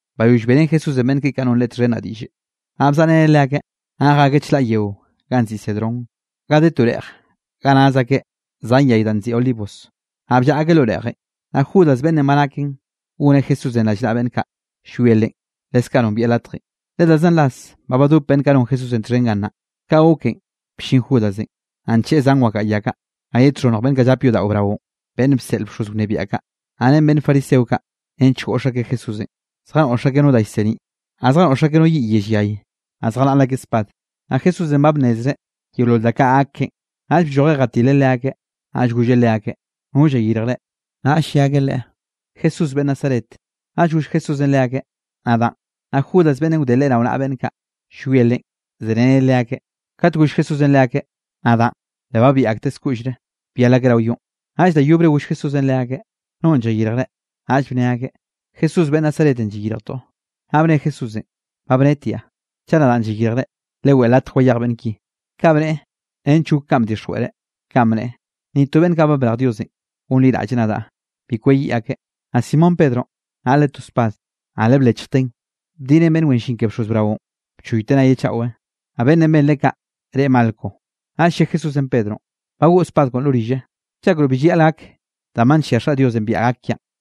Bayoll beꞌrén Jesúsenꞌ beꞌnn keꞌe kaꞌ non Leꞌe txhen naꞌ diꞌll, naꞌ bzaꞌreneꞌ leakeꞌ, naꞌ jakeꞌ chlaꞌ yeo ganꞌ nziꞌi Cedrón, ganꞌ de to reꞌj ga naz akeꞌ zan yay danꞌ nziꞌi olivos. Naꞌ bllaꞌa akeꞌ lo reꞌjenꞌ. Naꞌ Judas beꞌnnenꞌ ba naken goneꞌ Jesúsenꞌ rallnaꞌa beꞌnn kaꞌ llwie Leꞌen, leskaꞌ nombieꞌ latjenꞌ, le da zan ras ba badop beꞌnn kaꞌ non Jesúsenꞌ txhen gannaꞌ. Ka goken bllin Judasenꞌ, naꞌ ncheꞌe zan wakaꞌa ya kaꞌ, naꞌ ye txhonnj beꞌnn kaꞌ llap yodaꞌo braonꞌ, beꞌnn bseꞌl bxoz wnebiaꞌ kaꞌ, naꞌ ren beꞌnn fariseo kaꞌ, nench goꞌx akeꞌ Jesúsenꞌ. Zjanoꞌx akeꞌ no da llseniꞌ, naꞌ zjanoꞌx akeꞌ no yiꞌ yell yay, naꞌ zjanaꞌl akeꞌ spad. Naꞌ Jesúsenꞌ ba nnezreꞌ yeolol ka da kaꞌ gak keꞌen, naꞌll bllojeꞌ jatileꞌ leakeꞌ, naꞌll golleꞌ leakeꞌ: —¿No llayirjre? Naꞌll lle akeꞌ Leꞌe: —Jesús beꞌnn Nazaret. Naꞌll goll Jesúsenꞌ leakeꞌ: —Nadaꞌn. Naꞌ Judas beꞌnnenꞌ wde Leꞌe rao naꞌa beꞌnn kaꞌ, llwie Leꞌen, zereneꞌ leakeꞌ. Kate goll Jesúsenꞌ leakeꞌ: “Nadaꞌn”, le babiꞌ akteꞌ skoꞌllre, byal akeꞌ rao yonꞌ. Naꞌll da yobre goll Jesúsenꞌ leakeꞌ: —¿Nonꞌ llayirjre? Naꞌll bne akeꞌ: —Jesús beꞌnn Nazaretenꞌ llayirjtoꞌ. Naꞌ bne Jesúsenꞌ: —Ba bnetiaꞌ. Chaꞌ nadaꞌn llayirjre, leweꞌe latje wayej beꞌnn ki. Kaꞌ bneꞌe nench gok kanꞌ ba bdixjweꞌreꞌ, kanꞌ bneꞌe: “Ni to beꞌnn kaꞌ ba brej Diosenꞌ gonliraꞌlle nadaꞌ, bi kweyiꞌ akeꞌ.” Naꞌ Simón Pedronꞌ naꞌle to spad, naꞌ le blechjteꞌn bdineꞌn beꞌnn wen llin ke bxoz braonꞌ, bchoyteꞌ nayeꞌ chaꞌwenꞌ. Naꞌ beꞌnnenꞌ benreꞌ kaꞌ, reꞌe Malco. Naꞌll lle Jesúsenꞌ Pedronꞌ: —Bagoꞌ spad koꞌon lo rille. ¿Llakroꞌ bi llayaꞌl gak danꞌ ba nllia Xaꞌ Diosenꞌ biaꞌa gak kiaꞌn?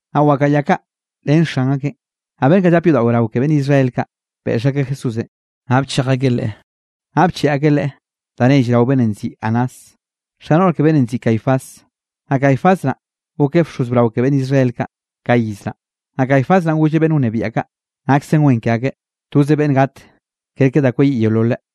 Naꞌ wakaꞌa ya kaꞌ ren xan akeꞌn, naꞌ beꞌnn kaꞌ llape yodaꞌo brao ke beꞌnn Israel kaꞌ, beꞌx akeꞌ Jesúsenꞌ, naꞌ bchej akeꞌ Leꞌe. Naꞌ bcheꞌe akeꞌ Leꞌe da nell rao beꞌnnenꞌ nziꞌi Anás, xa noꞌr ke beꞌnnenꞌ nziꞌi Caifás. Naꞌ Caifás naꞌ gokeꞌ bxoz brao ke beꞌnn Israel kaꞌ, ka iz naꞌ. Naꞌ Caifás naꞌn golleꞌ beꞌnn wnebiaꞌ kaꞌ, naksen wen ke akeꞌ, toze beꞌnne gat ker ke da kweyiꞌ yeololeꞌ.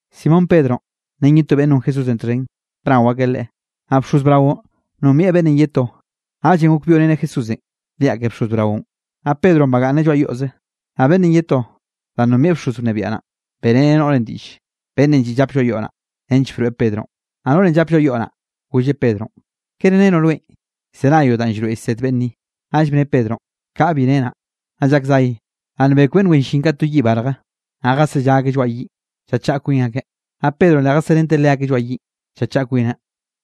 Simón Pedronꞌ ren ye to beꞌnn non Jesúsenꞌ txhen, bnao akeꞌ Leꞌe. Naꞌ bxoz braonꞌ nombieꞌ beꞌnnenꞌ ye to, naꞌllenꞌ gok byoꞌreneꞌ Jesúsenꞌ liaꞌ ke bxoz braonꞌ. Naꞌ Pedronꞌ bagaꞌnneꞌ lloaꞌ yoꞌze. Naꞌ beꞌnnenꞌ ye to, danꞌ nombieꞌ bxoz wnebiaꞌ naꞌn, beꞌreneꞌ noꞌrenꞌ diꞌlle, beꞌnnenꞌ lliꞌ llapeꞌ lloaꞌ yoꞌ naꞌ, nench broeꞌ Pedronꞌ. Naꞌ noꞌrenꞌ llap lloaꞌ yoꞌ naꞌ, golleꞌ Pedronꞌ: —¿Kere renoꞌ rweꞌn llzenayoꞌ danꞌ llroeꞌ llsed beꞌnn ni? Naꞌll bne Pedronꞌ: —Kaꞌa, bi renaꞌ. Naꞌ llak zay, naꞌ nbek beꞌnn wen llin kaꞌ to yiꞌ barje, naꞌ zjazellá akeꞌ lloaꞌ yiꞌn, llachaꞌa kwin akeꞌ. Naꞌ Pedronꞌ le jaserenteꞌ leakeꞌ lloaꞌ yiꞌn, llachaꞌa kwineꞌ.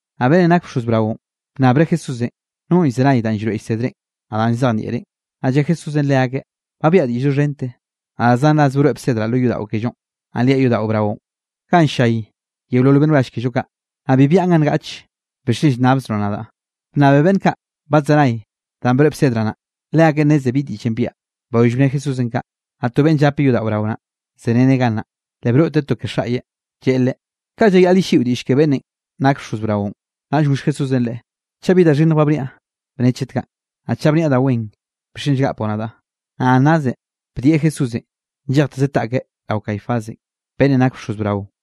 Naꞌ beꞌnnenꞌ nak bxoz braonꞌ, bnnabreꞌ Jesúsenꞌ nonꞌ llzenay danꞌ llroeꞌ llsedreꞌn, naꞌ danꞌ llzejnieꞌreꞌn. Naꞌ lle Jesúsenꞌ leakeꞌ: —Ba biaꞌa diꞌll doxhente, naꞌ da zan ras broeꞌ bsedraꞌ lo yodaꞌo kellonꞌ, naꞌ liaꞌ yodaꞌo brao, ganꞌ ll-llay yeolol beꞌnn wrall kello kaꞌ. Naꞌ bi biaꞌan ga ngaꞌch. ¿Bixchen llnnabzroꞌ nadaꞌ? Bnnabe beꞌnn kaꞌ badzenay danꞌ broeꞌ bsedraꞌ naꞌ. Leakeꞌn nneze bi diꞌllenꞌ biaꞌa. Bayoll bne Jesúsenꞌ kaꞌ, naꞌ to beꞌnnenꞌ llape yodaꞌo brao naꞌ, zereneꞌ gannaꞌ, le broꞌteꞌ to ke xaꞌyeꞌ, lleꞌe Leꞌe: —¿Kaꞌ llayaꞌl yelliꞌo diꞌll ke beꞌnnenꞌ nak bxoz braonꞌ? Naꞌll goll Jesúsenꞌ leꞌe: —Chaꞌ bi da xhinnj ba bniaꞌ, bne chet kaꞌ, naꞌ chaꞌ bniaꞌ da wen, ¿bixchen llgapoꞌ nadaꞌ? Naꞌ Anásenꞌ bdieꞌ Jesúsenꞌ nllejtezeꞌ taꞌkeꞌ rao Caifásenꞌ, beꞌnnenꞌ nakeꞌ bxoz braonꞌ.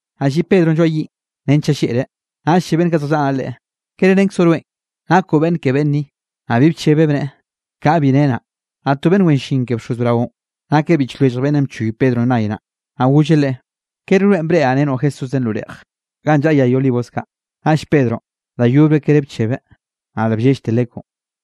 Naꞌ lliꞌ Pedronꞌ lloaꞌ yiꞌn nench llalleꞌreꞌ, naꞌll lle beꞌnn kaꞌ zjallaꞌa naꞌ leꞌe: —¿Kere renkzoꞌ rweꞌn nakoꞌ beꞌnn ke beꞌnn ni? Naꞌ bi bchebeꞌ, bneꞌe: —Kaꞌa, bi renaꞌ. Naꞌ to beꞌnn wen llin ke bxoz braonꞌ, nakeꞌ biꞌch lwellj beꞌnnenꞌ bchoy Pedronꞌ nay naꞌ, naꞌ golleꞌ leꞌe: —¿Kere rweꞌn breꞌraꞌ renoꞌ Jesúsenꞌ lo reꞌj, ganꞌ llaꞌa yay olivos kaꞌ? Naꞌll Pedronꞌ da yobre kere bchebeꞌ, naꞌ le bllellte lekwnꞌ.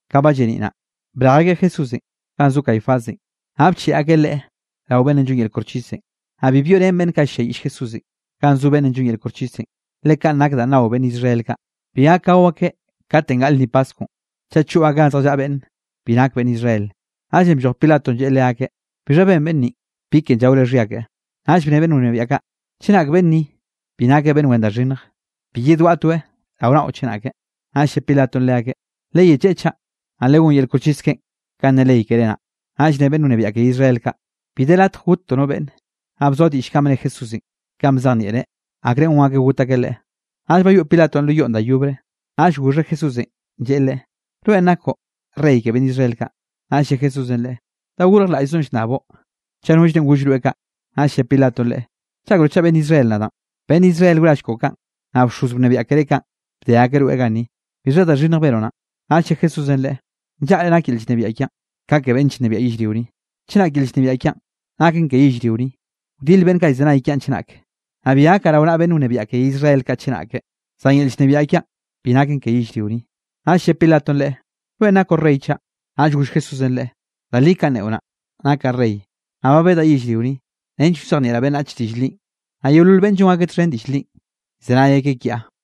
Ka ba lleniꞌ naꞌ, brej akeꞌ Jesúsenꞌ ganꞌ zo Caifásenꞌ, naꞌ bcheꞌe akeꞌ Leꞌe rao beꞌnnenꞌ llon yel koxchisenꞌ. Naꞌ bi byoꞌrén beꞌnn kaꞌ ll-lliayiꞌll Jesúsenꞌ, ganꞌ zo beꞌnnenꞌ llon yel koxchisenꞌ, le kanꞌ nak danꞌ nao beꞌnn Israel kaꞌ, bi gak gao akeꞌ katenꞌ gaꞌl lnni paskwnꞌ, chaꞌ choꞌ akeꞌ ganꞌ zjallaꞌa beꞌnn bi nake beꞌnn Israel. Naꞌllenꞌ blloj Pilatonꞌ lleꞌe leakeꞌ: —¿Bixha ben beꞌnn ninꞌ? ¿Bi ken llaore xhia keꞌe? Naꞌll bne beꞌnn wnebiaꞌ kaꞌ: —Chenak beꞌnn ni bi nakeꞌ beꞌnn wen da xhinnj, bi yedwaꞌtoeꞌ rao naꞌo chenake. Naꞌll lle Pilatonꞌ leakeꞌ: —Leyecheꞌe chaꞌ, naꞌ legón yel koxchis keꞌen kanꞌ ne ley keré naꞌ. Naꞌll ne beꞌnn wnebiaꞌ ke Israel kaꞌ: —Bi de latj gottoꞌ no beꞌnne. Naꞌ bzoa diꞌll kanꞌ bne Jesúsenꞌ kanꞌ bzejnieꞌreꞌ, akre gon akeꞌ got akeꞌ Leꞌe. Naꞌll bayoꞌ Pilatonꞌ lo yoꞌn da yobre, naꞌll goxheꞌ Jesúsenꞌ, lleꞌe Leꞌen: —¿Rweꞌn nakoꞌ Rey ke beꞌnn Israel kaꞌ? Naꞌll lle Jesúsenꞌ leꞌe: —¿Da gorjlaꞌllzoꞌn llnnaboꞌ, chaꞌ nollrenꞌ goll rweꞌ kaꞌ? Naꞌll lle Pilatonꞌ Leꞌe: —¿Llakroꞌ chaꞌ beꞌnn Israel nadaꞌn? Beꞌnn Israel wrall koꞌo kaꞌn, naꞌ bxoz wnebiaꞌ keré kaꞌn, bde akeꞌ rweꞌ ganni. ¿Bixha da xhinnj benoꞌ naꞌn? Naꞌll lle Jesúsenꞌ leꞌe: —Nllaꞌre nak yel llnebiaꞌ kiaꞌn, ka ke beꞌnn llnebiaꞌ yellrio ni. Chenak yel llnebiaꞌ kiaꞌn naken ke yellrio ni, wdil beꞌnn kaꞌ llzenay kiaꞌn chenak, naꞌ bi gakaꞌ rao naꞌa beꞌnn wnebiaꞌ ke Israel kaꞌ chenake. Zan yel llnebiaꞌ kiaꞌn bi naken ke yellrio ni. Naꞌll lle Pilatonꞌ Leꞌe: —¿Rweꞌn nakoꞌ rey chaꞌ? Naꞌll goll Jesúsenꞌ leꞌe: —Da li kanꞌ neꞌo naꞌ, nakaꞌ rey, naꞌ ba bedaꞌ yellrio ni, nench wzejnieꞌraꞌ beꞌnnach diꞌll linꞌ, naꞌ yeolol beꞌnn llon ak txhen diꞌll linꞌ, llzenay akeꞌ kiaꞌ.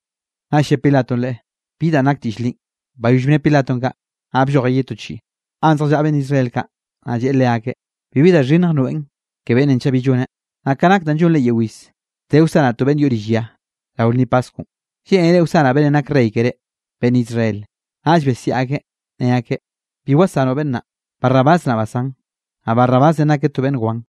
Naꞌll lle Pilatonꞌ Leꞌe: —¿Bi danꞌ nak diꞌll linꞌ? Bayoll bne Pilatonꞌ kaꞌ, naꞌ bllojeꞌ ye to chiꞌi, ganꞌ zjallaꞌa beꞌnn Israel kaꞌ, naꞌ lleꞌe leakeꞌ: —Bibi da xhinnj nroeꞌn ke beꞌnnenꞌ chaꞌ bi lloneꞌ. Naꞌ ka nak danꞌ llonre yeo iz, de wsanaꞌ to beꞌnn yoꞌ rill ya rao lnni Paskwnꞌ. ¿Lleꞌnere wsanaꞌ beꞌnnenꞌ nak rey keré, beꞌnn Israel? Naꞌll besiaꞌ akeꞌ, ne akeꞌ: —¡Bi wasanoꞌ beꞌnn naꞌ! ¡Barrabás naꞌ basán! Naꞌ Barrabásenꞌ nakeꞌ to beꞌnn wan.